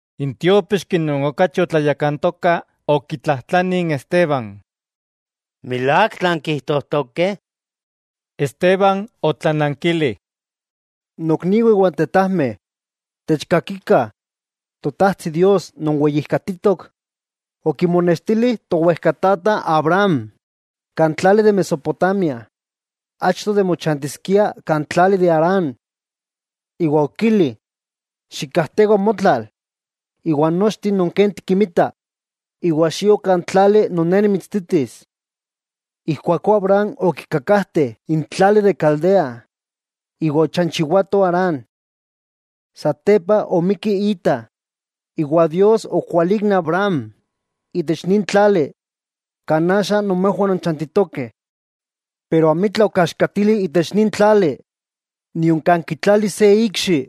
N tiópixki non okachi otlayakantoka okitlajtlani n Esteban: —¿Milák tlan kijtojtokeh? Esteban otlanankili: —Nokniwah iwa tetajmeh, techkakikah, Totajtsi Dios non weyijkatitok okimonextili towejkatata Abraham kan tlali de Mesopotamia, achto de mochantiskia kan tlali de Harán, iwa okili: “Xikkakajtewa motlal iwa nochteh non ken tikinmita, iwa xio kan tlali non Ne nimitsititis.” Ijkuakó Abraham okikakajte n tlali de Caldea iwa ochanchiwato Harán. Satepa omikki ita, iwa Dios okwalík n Abraham itech nin tlali, kan axa nomejwah nonchantitokeh. Pero amitla okiaxkatili itech nin tlali, nion kan kitlalis se ikxi.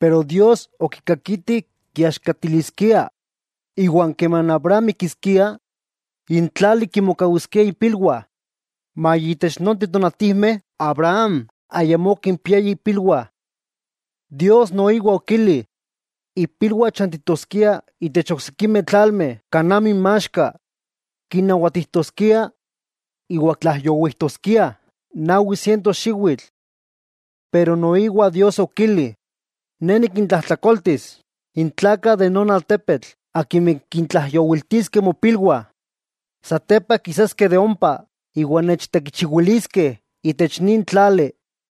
Pero Dios okikakiti kiaxkatiliskia, iwa keman Abraham mikiskia n tlali kimokawiskiah ipilwah; maya itech nonteh tonatijmeh Abraham ayamó okimpiaya ipilwah. Dios noiwa okili, ipilwah chantitoskiah itech oksikimeh tlalmeh kan amo inmaxka, kinnawatijtoskiah iwa tlaijyowijtoskiah nawi siento xiwitl. Pero noiwa Dios okili: “Ne nikintlajtlakoltis n tlakah de non altepetl akimeh kintlaijyowiltiskeh mopilwah, satepa kisaskeh de ompa iwa nechtekichiwiliskeh itech nin tlali.”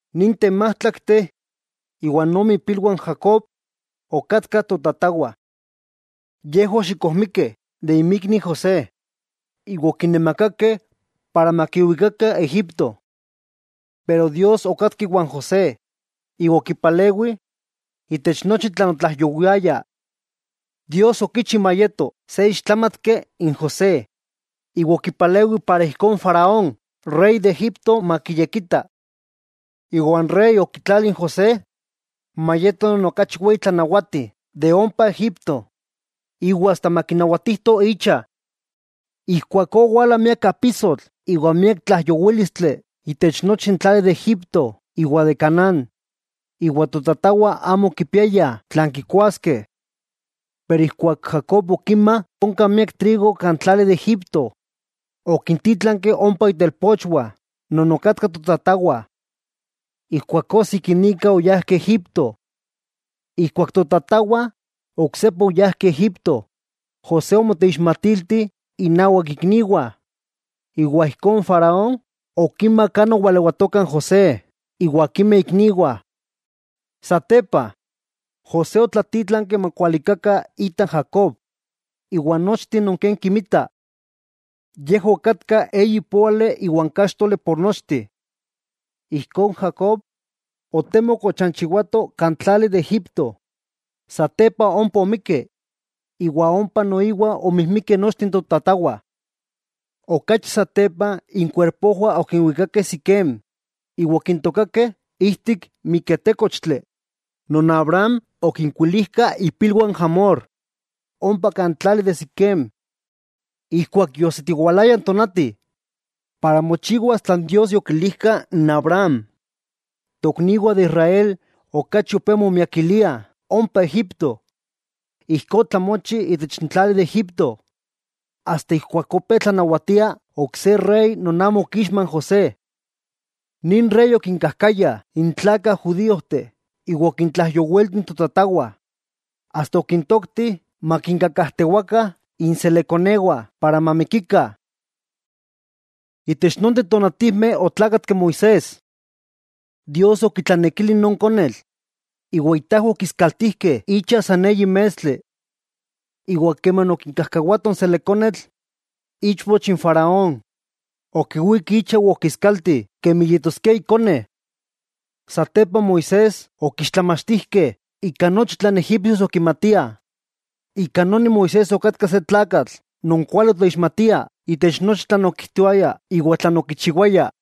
'Ninteh májtlakteh iwa ome ipilwah n Jacob, okatkah totatawah. Yejwah oxikojmikeh de inmikni José, iwa okinamakakeh para makiwikakah Egipto. Pero Dios okatka iwan José, iwa okipalewi itech nochi tlan otlaijyowiaya. Dios okichi mayeto se ixtlámatki n José iwa okipalewi para ijkó n Faraón rey de Egipto makiyekita. Iwa n rey okitlali n José mayeto non okachi weyi tlanawati de ompa Egipto iwa asta makinawatijto icha. 'Ijkuakó owala miak apisotl iwa miak tlaijyowílistli itech nochi n tlali de Egipto iwa de Canaán, iwa totatawah amo okipiayah tlan kikuaskeh. Pero ijkuak Jacob okima onka miak trigo kan tlali de Egipto, okintítlanki ompa itelpochwah non okatka totatawah. Ijkuakó sikinika oyajkeh Egipto. Ijkuak totatawah oksepa oyajkeh Egipto, José omoteixmatilti innawak ikniwah, iwa ijkó n Faraón okima kan owalewatoka n José iwa akimeh ikniwah. Satepa, José otlatítlanki makualikakah ita Jacob iwa nochteh non ken kinmita. Yejwah okatkah eyi póali iwa káxtoli por nochteh. Ijkó n Jacob otemok ochanchiwato kan tlali de Egipto. Satepa ompa omikki, iwa ompa noiwa omijmikeh nochteh totatawah. Okachi satepa inkuerpojwah okinwikakeh Siquem iwa okintookakeh ijtik miketékochtli non Abraham okinkuilijka ipilwah n Hamor ompa kan tlali de Siquem. 'Ijkuak yoajsitiwalaya n tonati para mochiwas tlan Dios yokilijka Abraham, n tokniwah de Israel okachi opé momiakiliah ompa Egipto. Ijkó otlamochi itech tlali de Egipto asta ijkuak opé tlanawatia ok se rey non amo okixma n José. Nin rey okinkajkaya n tlakah judíojteh iwa okintlaijyowilti totatawah, asta okintokti makinkakajtewakah inselekkonewah para mamikikah. Itech nonteh tonatijmeh otlákatki Moisés. Dios okitlanekili non konetl, iwa itajwah okiskaltijkeh icha san eyi mestli. Iwa keman okikajkawatoh n selekkonetl, ichpoch n Faraón, okiwík icha iwa okiskalti kemi yetoskia ikone. Satepa Moisés okixtlamachtijkeh ika nochi tlan egipsios okimatiah, ika noni Moisés okatka se tlakatl non kuali oixtlamatia itech nochi tlan okijtoaya iwa tlan okichiwaya.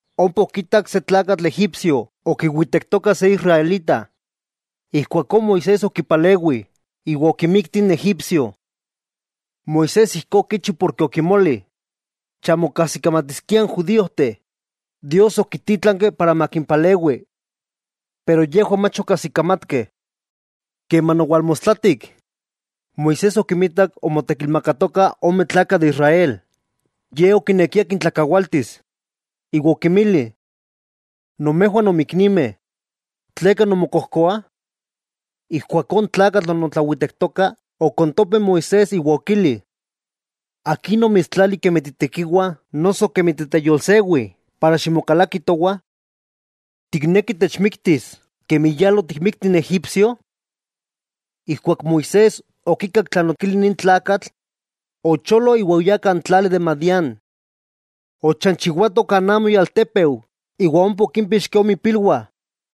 Ompa okitak se tlakatl egipsio okiwitektoka se israelita, ijkuakó Moisés okipalewi iwa okimikti n egipsio. Moisés ijkó okichi porke okimoli chamo kajsikamatiskiah n judíojteh Dios okitítlanki para makimpalewi. Pero yejwah mach okajsikamatkeh. Keman owalmostlatik, Moisés okimitak omotekilmakatokah ome tlakah de Israel, ye okinekia kintlakawaltis, iwa okinmili: “Nomejwah nonmiknimeh; ¿tleka nonmokojkoah?” Ijkuakó n tlakatl non otlawitektoka okontope n Moisés, iwa okili: “¿Akin omitstlali kemi titekiwa noso kemi titeyolsewi para ximokalaki towah? ¿Tikneki techmiktis, kemi yala otikmikti n egipsio?” Ijkuak Moisés okikak tlan okili nin tlakatl, ocholo iwa oyá kan tlali de Madián. Ochanchiwato kan amo ialtépeu iwa ompa okímpixki ome ipilwah.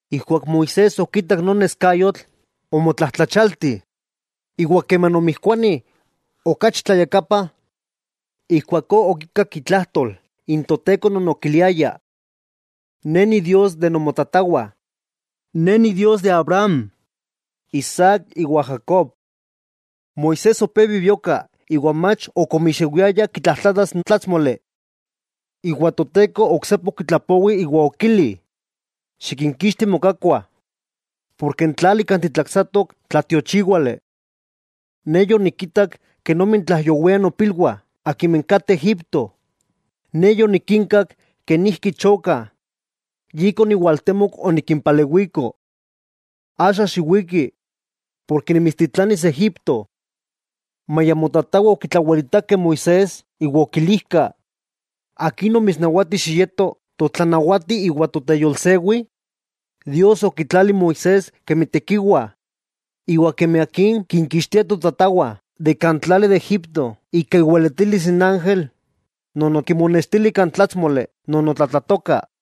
Ijkuak Moisés okitak non neskayotl, omotlajtlachialti, iwa keman omijkuani okachi tlayakapa, ijkuakó okikak itlajtol n Toteko non okiliaya: “Ne Idios nomotatawah, Ne Idios Abraham, Isaac iwa Jacob.” Moisés opé bibioka iwa mach ok omixewiaya kitlajtlatas n tlátsmoli. Iwa Toteko oksepa okitlapowi iwa, okili: “Xikinkixti mokakuah, porke n tlali kan titlaksatok tlatiochíwali. Ne yonikitak kenomi tlaijyowiah nopilwah akimeh kateh Egipto, Ne yonikinkak kenijki chokah, yika oniwaltemok onikimpalewiko. Axa, xiwiki, porke nimitstitlanis Egipto.” 'Maya nomotatawah okitlawelitakeh n Moisés iwa okilijkah: “¿Akin omitsnawati xiyeto totlanawati iwa toteyolsewi?” Dios okitlali n Moisés kemi tekiwa iwa kemi akin kinkixtiskia totatawah de kan tlali de Egipto ika iweletilis n ángel non okimonextili kan tlátsmoli non otlatlatoka.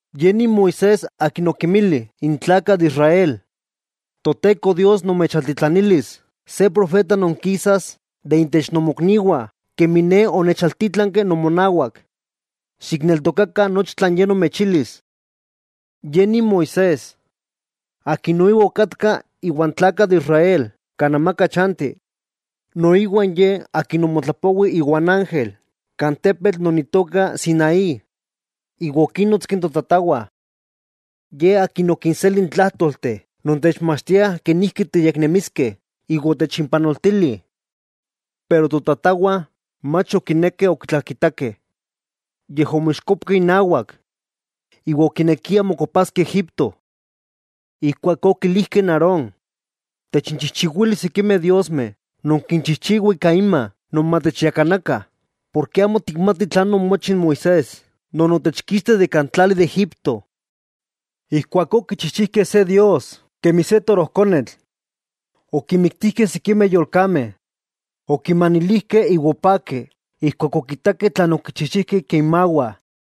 Ye nin Moisés akin okinmili n tlakah de Israel: “Toteko Dios nomechaltitlanilis se profeta non kisas de intech nomokniwah kemi ne onechaltítlanki nomonawak. Xikneltokakah nochi tlan Ye nomechilis.” Ye nin Moisés, akin noiwa okatka iwa n tlakah de Israel kan amaka chanti. Noiwa ye akin omotlapowi iwa n ángel kan tepetl non itoka Sinaí iwa okinnonotski totatawah. Ye akin okinseli n tlájtolteh non techmachtiah kenijki tiyeknemiskeh iwa otechimpanoltili. 'Pero totatawah mach okinekeh okitlakitakeh, yej omoixkopkeh inawak iwa okinekiah mokopaskeh Egipto. Ijkuakó okilijkeh n Aarón: “Techinchijchiwili sikimeh diosmeh non kinchijchiwah ika inma non matechyakanakah porke amo tikmatih tlan omochi n Moisés non otechkixti de kan tlali de Egipto.” Ijkuakó okichijchijkeh se “dios” kemi se torojkonetl. Okinmiktijkeh sikimeh yolkameh, okinmanilijkeh iwa opakeh ijkuak okitakeh tlan okichijchijkeh ika inmawah.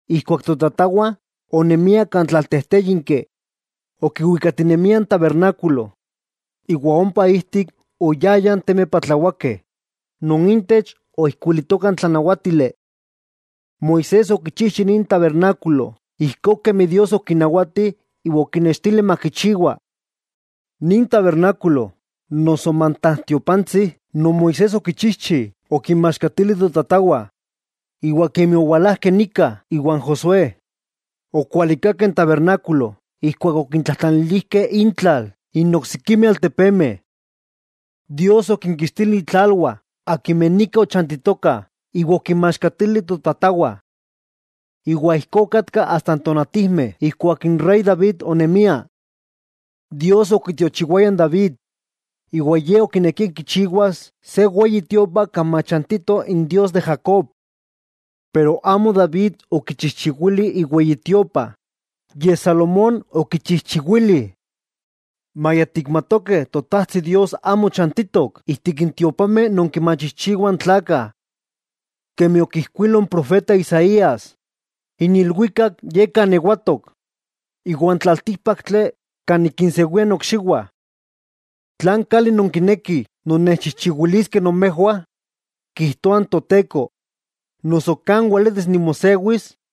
'Ijkuak totatawah onemiah kan amaka chanti, okiwikatinemiah n tabernákulo, iwa ompa ijtik oyayah n temeh patlawakeh non intech oijkuilitoka n tlanawátili. Moisés okichijchi nin tabernákulo ijkó kemi Dios okinawati iwa okinextili makichijchiwa. Nin tabernákulo noso mantajtiopantsi non Moisés okichijchi okinmaxkatili totatawah, iwa akimeh owalajkeh nika iwan Josué, okualikakeh n tabernákulo ijkuak okintlanilijkeh intlal n oksikimeh altepemeh. Dios okinkixtili intlalwah akimeh nika ochantitokah iwa okinmaxkatili totatawah. Iwa ijkó okatka asta n tonatijmeh ijkuak n rey David onemia. Dios okitiochiwaya n David, iwa ye okinekia kichiwas se Weyi Tiopa kan machantito Idios Jacob. Pero amo David okichijchiwili iweyitiopa, yej Salomón okichijchiwili. Maya tikmatokeh Totajtsi Dios amo chantitok ijtik tiopameh non kinmachijchiwah n tlakah. Kemi okijkuilo n profeta Isaías: N ilwikak ye kan niewatok, iwa n tlaltíkpaktli kan nikinsewia nokxiwah. ¿Tlan kali nonkinekih nonnechchijchiwiliskeh nomejwah?, kijtoa n Toteko, ¿noso kan weletis nimosewis?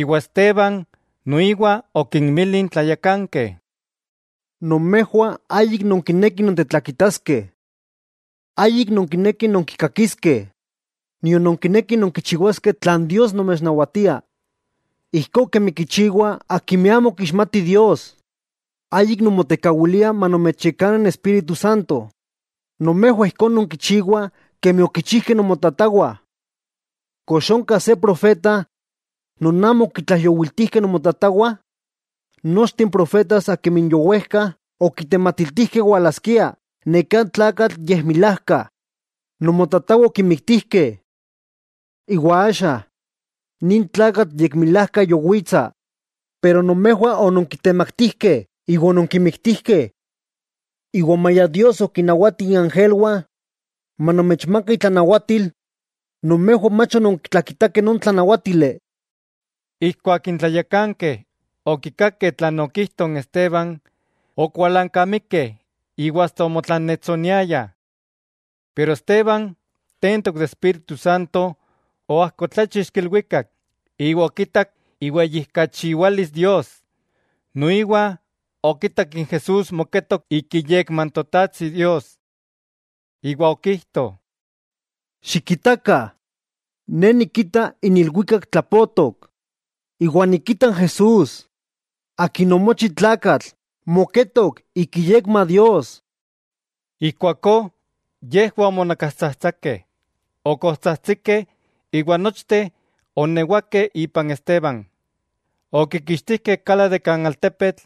Iwa Esteban noiwa okinmili n tlayakankeh: —Nomejwah ayik nonkinekih nontetlakitaskeh. Ayik nonkinekih nonkikakiskeh nion nonkinekih nonkichiwaskeh tlan Dios nomechnawatia, ijkó kemi kichiwah akimeh amo kixmatih Dios. Ayik nonmotekawiliah manomechyakana n Espíritu Santo, nomejwah ijkó nonkichiwah kemi okichijkeh nomotatawah. ¿Kox onka se profeta non amo okitlaijyowiltijkeh nomotatawah? Nochteh n profetas akimeh yowejka okitematiltijkeh walaskia neká tlakatl yekmilajka, nomotatawah okimiktijkeh. Iwa axa, nin tlakatl yekmilajka yowitsa, pero nomejwah ononkitemaktijkeh iwa ononkimiktijkeh. Iwa maya Dios okinnawati iangelwah manomechmakakah itlanawatil, nomejwah mach ononkitlakitakeh non tlanawátili. Ijkuak n tlayakankeh okikakeh tlan okijto n Esteban, okualankamikeh iwa asta omotlannetsoniayah. Pero Esteban tentok de Espíritu Santo, oajkotláchixki ilwikak iwa okitak iweyijkachiwalis Dios, noiwa okitak n Jesús moketok ik iyekma n Totajtsi Dios. Iwa okijto: —¡Xikitakah! Ne nikita n ilwikak tlapotok, iwa nikita n Jesús Akin omochi tlakatl moketok ik iyekma Dios. Ijkuakó yejwah omonakastsajtsakeh, okojtsajtsikeh iwa nochteh oonewakeh ipan Esteban. Okikixtijkeh kala de kan altepetl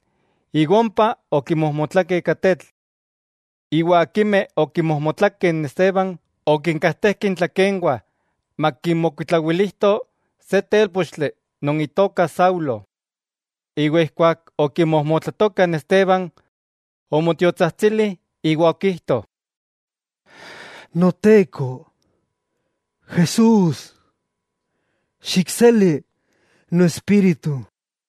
iwa ompa okimojmotlakeh ika tetl. Iwa akimeh okimojmotlakeh n Esteban, okinkajtejkeh intlakenwah makinmokuitlawilijto se télpochtli non itoka Saulo. Iwa ijkuak okimojmotlatokah, Esteban omotiotsajtsili iwa okijto: —Noteko Jesús, xikseli noespíritu.